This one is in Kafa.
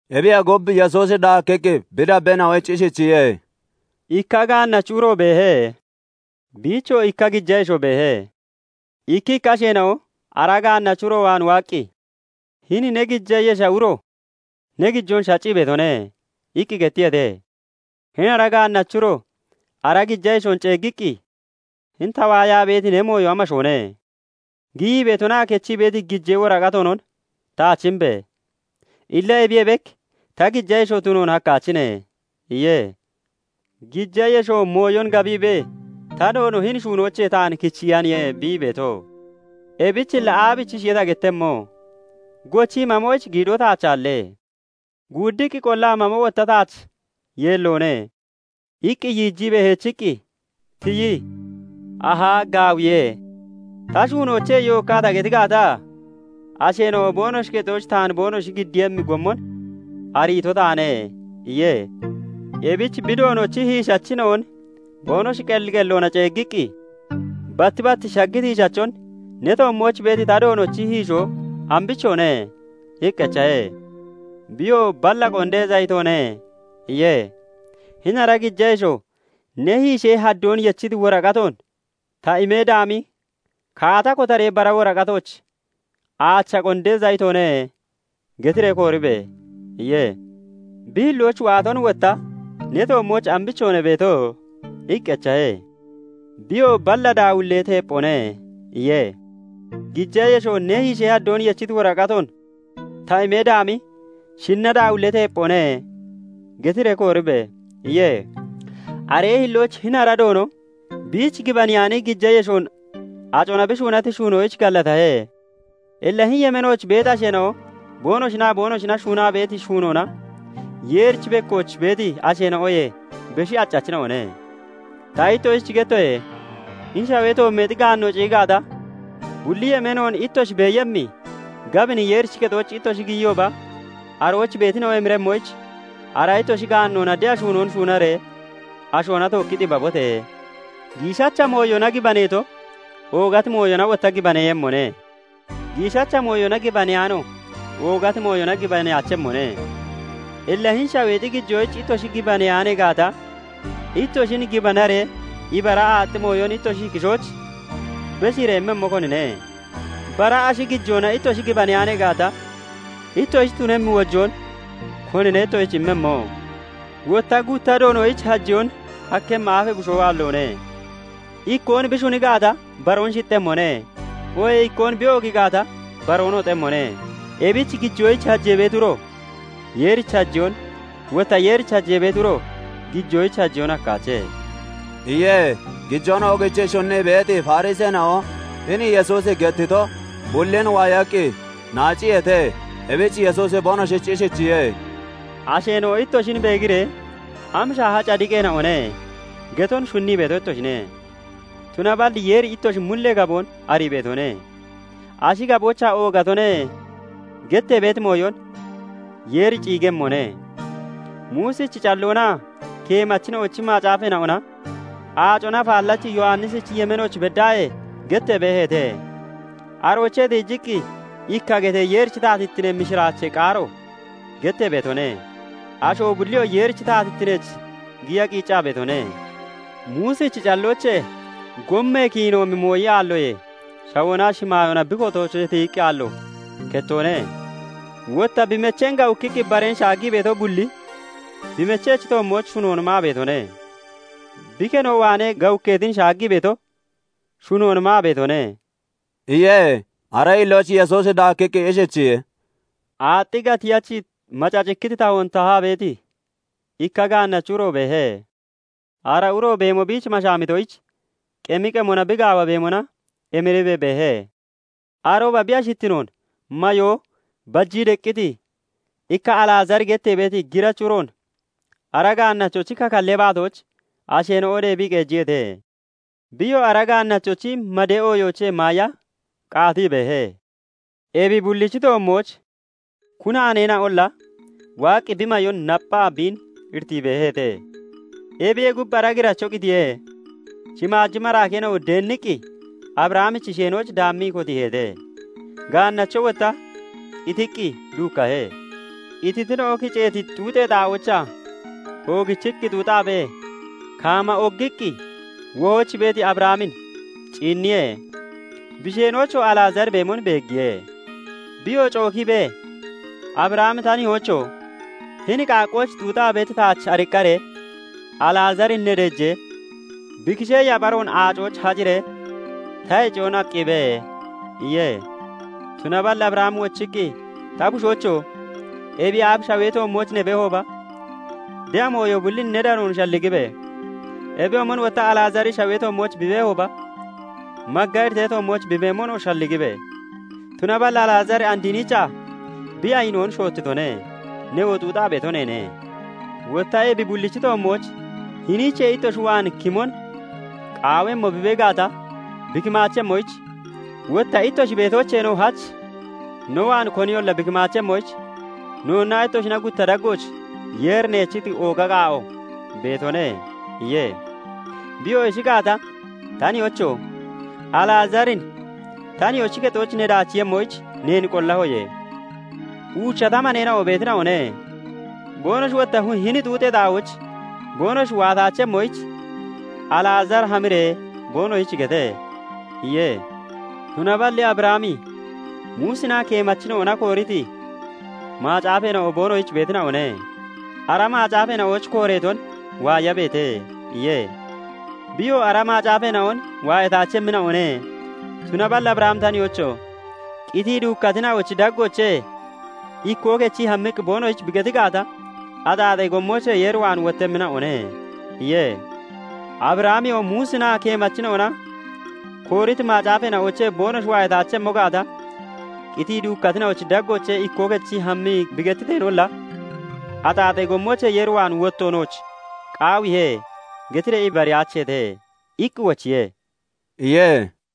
Ebiyee gub, Yesuusi daakkiqqi bi dabbeena'oyich ishichiye:- "Ikka gaannachi uro beehe; biichoo ikka gija yesho beehe.Ikkikka asheena'o ara gaannachi uro waan waaqqi, 'Hini ne gija yesha uro ne gijoon shaccii beetone' iqqi gettiyeete. "Hini ara gaannachi uroo ara gija yeshoon ceeggiiqqi, 'Hini ta waayaa beeti ne mooyo amashoone? Giyii beetonaa kechii beeti gijee woraqatoonon taach imbe! Illa ebiyee bek ta gija yesho tunoon hakkaachine' iye. "Gija yesho mooyon gabiibee 'Ta doono hini shuunoochee taan kichiyaniye bi ii beeto. Ebich illa aabichishiye ta gettemmo? Gochii mamoyich giidoo taach aalle; guuddiqqi qollaa mamo wotta taach yeelloone' iqqi yiijiibee heechiqqi tiyii 'Ahaa! Gaawiye! Ta shuunoochee yookkaa ta geti gaata, asheena'o boonoshi kexooch taan boonoshi giddiiyemmi gommon ariito taane' iye. "Ebich bi doonochi hiishachina'on boonoshi qelli qelloona ceeggiqqi, batti bat shaggiti hiishachon 'Ne toommooch beeti ta doonochi hiishoo ambichoone?' iqqi echahe. "Biyoo 'Balla qondee zayitoone' iye. "Hini ara gija yesho 'Ne hiishee haddoon yechiti woraqatoon ta imee daami, kaata kotaree bara woraqatooch "Aacha qondee zayitoone" getiree kooribe!' iye. "Bi hillooch waaton wotta 'Ne toommooch ambichoone beeto?' iqqi echahe. "Biyoo 'Balla daawillee teepphoone' iye. "Gija yesho 'Ne hiishee haddoon yechiti woraqatoon ta imee daami, "Shinna daawillee teepphoone" getiree kooribe!' iye. "Aree hillooch hini ara doono biich gibaneyaani gija yeshoon acona bi shuunati shuunoyich gallatahe. Illa hini yemeenooch beeti asheena'o boonoshinaa boonoshina shuunaa beeti shuunoona Yeerichi bekkooch beeti asheena'oyee beshi accachina'one. Ta ittoshich gettoye; hini shaweexi gaanno ciyi gaata, bulli yemeenoon ittoshi beeyemmi gabini Yeerichi kexooch ittoshi giyiyooba arooch beetina'o emiremmoyich, ara ittoshi gaannoona de'a shuunoon shuunaree ashoona tookki xibabote! "Giishacha mooyona gibaneeto oogati mooyona wotta gibaneeyemmone; giishacha mooyona gibaneyaano oogati mooyona gibaneyaachemmone. Illa hini shaweexi gijoyich ittoshi gibaneyaanee gaata, ittoshin gibanaree ibara aaxxi mooyon ittoshi kishooch beshiiree immemmo konine? Bara ashi gijoona ittoshi gibaneyaanee gaata, ittoshich tunemmi wojoon konine ittoshich immemmo? "Wotta gutta doonoyich hajeyoon hakkemmi aafee bushoo aalloone. Ikkoon bi shuni gaata, baroon shixxemmone; oohee ikkoon bi oogii gaata baroon hoxemmone. Ebich gijoyich hajee beeti uro Yeerich hajeyoon, wotta Yeerich hajee beeti uro gijoyich hajeyoon hakkaache" iye. Gijoon oogichii shunnii beeti Fariseena'o hini Yesuusi gettito bullin waayaqqi naaciyeete. Ebich Yesuusi boonoshich ishichiye:- "Asheena'o ittoshin beegiree, 'Am shaaha cadiqeena'one!' getoon shunnii beeto ittoshine; tunaballi Yeeri ittoshi mullee gaboon arii beetone. Ashi gaboochaa 'oogatone' gettee beeti mooyon Yeeri ciigemmone. "Muusichi calloonaa keemachina'ochi macaafeena'ona Aacona Afaallachi Yowannisichi yemeenooch beddaahee gettee beeheete. Aroochee tiijiqqi ikka getee Yeerichi taatittinee mishiraachee qaaro gettee beetone; asho bulliyoo Yeerichi taatittineech giya qiiccaa beetone. Muusichi calloochee gommee kiinoomi mooyi aalloyee shawoonaa shimaayoona bi kotoochee tiyiqqi aallo kettoone. "Wotta bi mecheen gawukkiqqi bareen shaaggii beeto bulli, bi mechechi toommooch shunoon maa beetone; bi keno waanee gawukkeetin shaaggii beeto shunoon maa beetone" iye. Aree hillooch Yesuusi daakkiqqi ishichiye:- "Aaxxi gatiyachi, macacikkiti tahoon tahaa beeti ikka gaannachi uro beehe. Ara uro beemo biich mashaamitoyich, qemi qemona bi gaawa beemona emiriibee beehe. "Arooba bi ashittinoon mayoo bajii deqqiti ikka Alazaari gettee beeti girachi uroon ara gaannachochi kakallee baatooch asheena'o deebii qeejiyeete. Biyoo ara gaannachochi madee ooyoochee maaya qaatii beehe. Ebi bullichi toommooch kunaaneena'olla waaqqi bi mayoon napphaa biin iritii beeheete. "Ebiyee gub, ara giracho qitiye; shimaaji maraakeena'o deenniqqi Abrahamichi sheenooch daammii kotiiheete. Gaannacho wotta qitiqqi duukkahe. Qititina'o kiceeti xuuxee xaa'oochaa oogichiqqi xuuxaabee, kaama ogiqqi wohooch beeti Abrahamin ciinniye; bi sheenoochoo Alazaari beemon beeggiye. Biyoo cookiibee, 'Abrahami ta nihoocho! Hini qaaqqooch xuuxaa beeti taach ariqqaree Alazaarin ne deejee, bi kishee yapharoon aacooch haciree ta heciyoon aqqiibe' iye. "Tunaballi Abrahami wochiqqi, 'Ta bushoocho! Ebiyee aaf shawee toommooch ne beehooba, de'a mooyo bullin ne danoon shalligibe! Ebiyoomon wotta Alazaari shawee toommooch bi beehooba, magga iritee toommooch bi beemonoo shalligibe! Tunaballi Alazaari and hiniichaa bi ayinoon shoottitone; newoo xuuxaa beeto neene. Wotta ebi bullichi toommooch hiniichee ittoshi waan kimon qaawemmo bee gaata bi kimaachemmoyich, wotta ittoshi beetoocheenoo hach no waan koniyolla bi kimaachemmoyich, noonnaa ittoshina gutta daggooch Yeeri neechiti ooga qaa'o beetone' iye. "Biyoo 'Ishi gaata, ta nihoocho! Alazaarin ta nihoochi kexooch ne daachiiyemmoyich neen qollahoye; uucha ta maneena'o beetina'one. Boonoshi wotta hini xuuxee xaa'ooch boonoshi waataachemmoyich, Alazaari hamiree boonoshich gete' iye. "Tunaballi Abrahami 'Muusinaa keemachina'ona kooriti macaafeena'o boonoshich beetina'one; ara macaafeena'ooch kooreeton waayabeete' iye. "Biyoo 'Ara macaafeena'on waayataachemmina'one; tunaballi Abrahami ta nihoocho! Qitii duukkatina'ochi daggoochee ikkoo kechii hammiqqi boonoshich bi geti gaata, axaaxee gommoochee Yeer waan wottemmina'one' iye. " 'Abrahamiyoo Muusinaa keemachina'ona kooriti macaafeena'oochee boonoshi waayataachemmo gaata, qitii duukkatina'ochi daggoochee ikkoo kechii hammii bi gettiteenolla, "Axaaxee gommoochee Yeer waan wotto nooch qaawiihe" getiree ibariyaacheete' iqqi wochiye" iye.